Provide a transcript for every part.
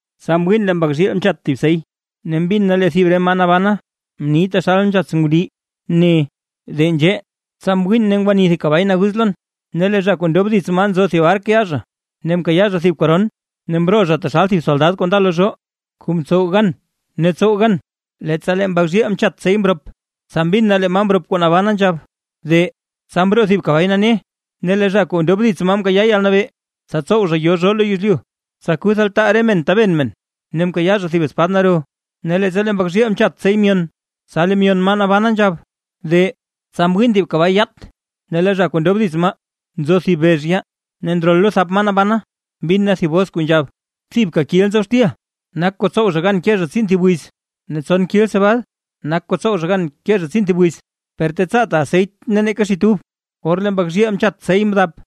Tsa mwiin lee Mbak zhiil mchat thib sey. Ne mbin na lee thib re maa nabana mni taxal nzhats ngundii ne: ―¡De nzhee! Tsa mwiin ne ngwani thib kabay naguz lon; ne lee zha kuu ndob dits maa nzo thib ark yaa zha. Ne mkayaa zha thib koron, ne mroo zha taxal thib soldad kuu nda lo zhoo, kuu mtsow gan ne tsow gan. Leettsa lee Mbak zhiil mchat sey mrop, tsa mbin na lee maa mrop kuu nabana nzhab: ―¡De! Tsa mroo thib kabay nane, ne lee zha kuu ndob dits maa mkayaa yalnabee, tsa tsow zha yo zhoo lo yezlyu, tsa kuth altaa re men taben men; ne mkayaa zha thib espad naro. Ne leettsa lee Mbak zhiil mchat sey myon, tsa lee myon maa nabana nzhab: ―¡De! Tsa mwiin thib kabay yaat, ne lee zha kuu ndob dits maa, nzo thib bex yaa. Ne ndrol lo thap maa nabana mbin na thib bos kuu nzhab: ―Thibka kil nzob xtil, nak kuu ntsow zha gan ke zha tsiin thib wiz, ne tson kil cebad nak kuu ntsow zha gan ke zha tsiin thib wiz; per tetsaata aseyt ne neeka xit ub. Or lee Mbak zhiil mchat sey mdap,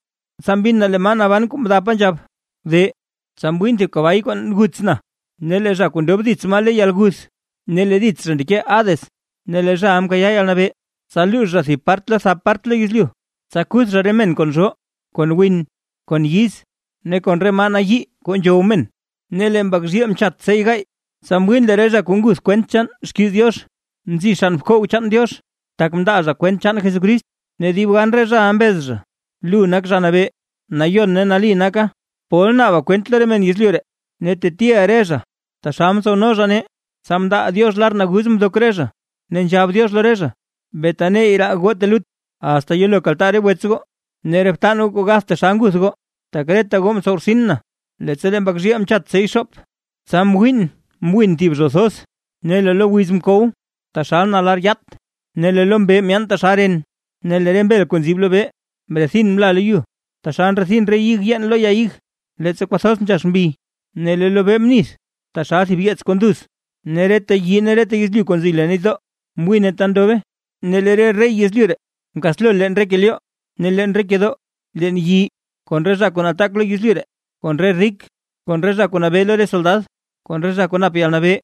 tsa mbin na lee maa naban kuu mdapa nzhab: ―¡De! Tsa mwiin thib kabay kuu guts na, ne lee zha kuu ndob dits maa le yalguth, ne lee dits zha ndeke Hades. Ne lee zhaʼa mkayaa yalnabee, tsa luux zha thib part lo thap part lo yezlyu, tsa kuth zha re men kon zhoo, kon win, kon yiz ne kon re maa nayii kuu nzhow men. Ne lee Mbak zhiil mchat sey gaay. Tsa mwiin lee re zha kuu nguth kwent chaan xkiiz Diox, nzi xann bkoog chaan Diox, tak mndaa zha kwent chaan Jesucrist. Ne dib gan re zhaʼa mbez zha: ―Lu nak Zha Nabee, nayon ne nali naka, ¿pol naaba kwent lo re men yezlyu, ne tetiʼa re zha taxal mtsowno zha nee? Tsa mndaa Diox lar naguz mdok re zha, ne nzhab Diox lo re zha: ―Bee taneyy raa goo telut, asta yelo kaltaa re wets goo ne re btan goo kuu gath taxal nguth goo, tak reta goo ntsow rtsin na. Leettsa lee Mbak zhiil mchat sey xoop. Tsa mwiin mwin thib zho thoz. Ne lee lo wiz mkow taxal na lar yaat ne lee lo mbee myaan taxal ren, ne lee re mbel kuu nzib lobee mrethin mla lo yu, taxal ndrethin re ig yeen lo ya ig, leettsa kwathoz nzhax mbi. Ne lee lobee mnith taxal thib yeets kuu nduz, ne reta yii ne reta yezlyu kuu nzi leen nitdoo, mwine ta ndobe. Ne lee re rey yezlyu ree mkaslo leen re kelyoo, ne re leen re kedoo, leen yii, kon re zha kuu nataak lo yezlyu, kon re rik, kon re zha kuu nabee lo re soldad, kon re zha kuu nap yalnabee,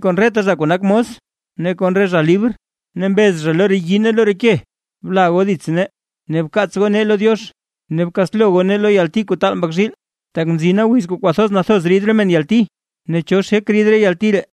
kon reta zha kuu nak mos ne kon re zha libr; ne mbez zha lo re yii ne lo re ke: ―Bla goo dits nee, ne bkaatslo goo nee lo Diox, ne bkaatslo goo nee lo yalti kuu taal Mbak zhiil. Tak mzina wiz kuu kwathoz nathoz rid re men yalti; ¿ne cho xek rid re yalti ree?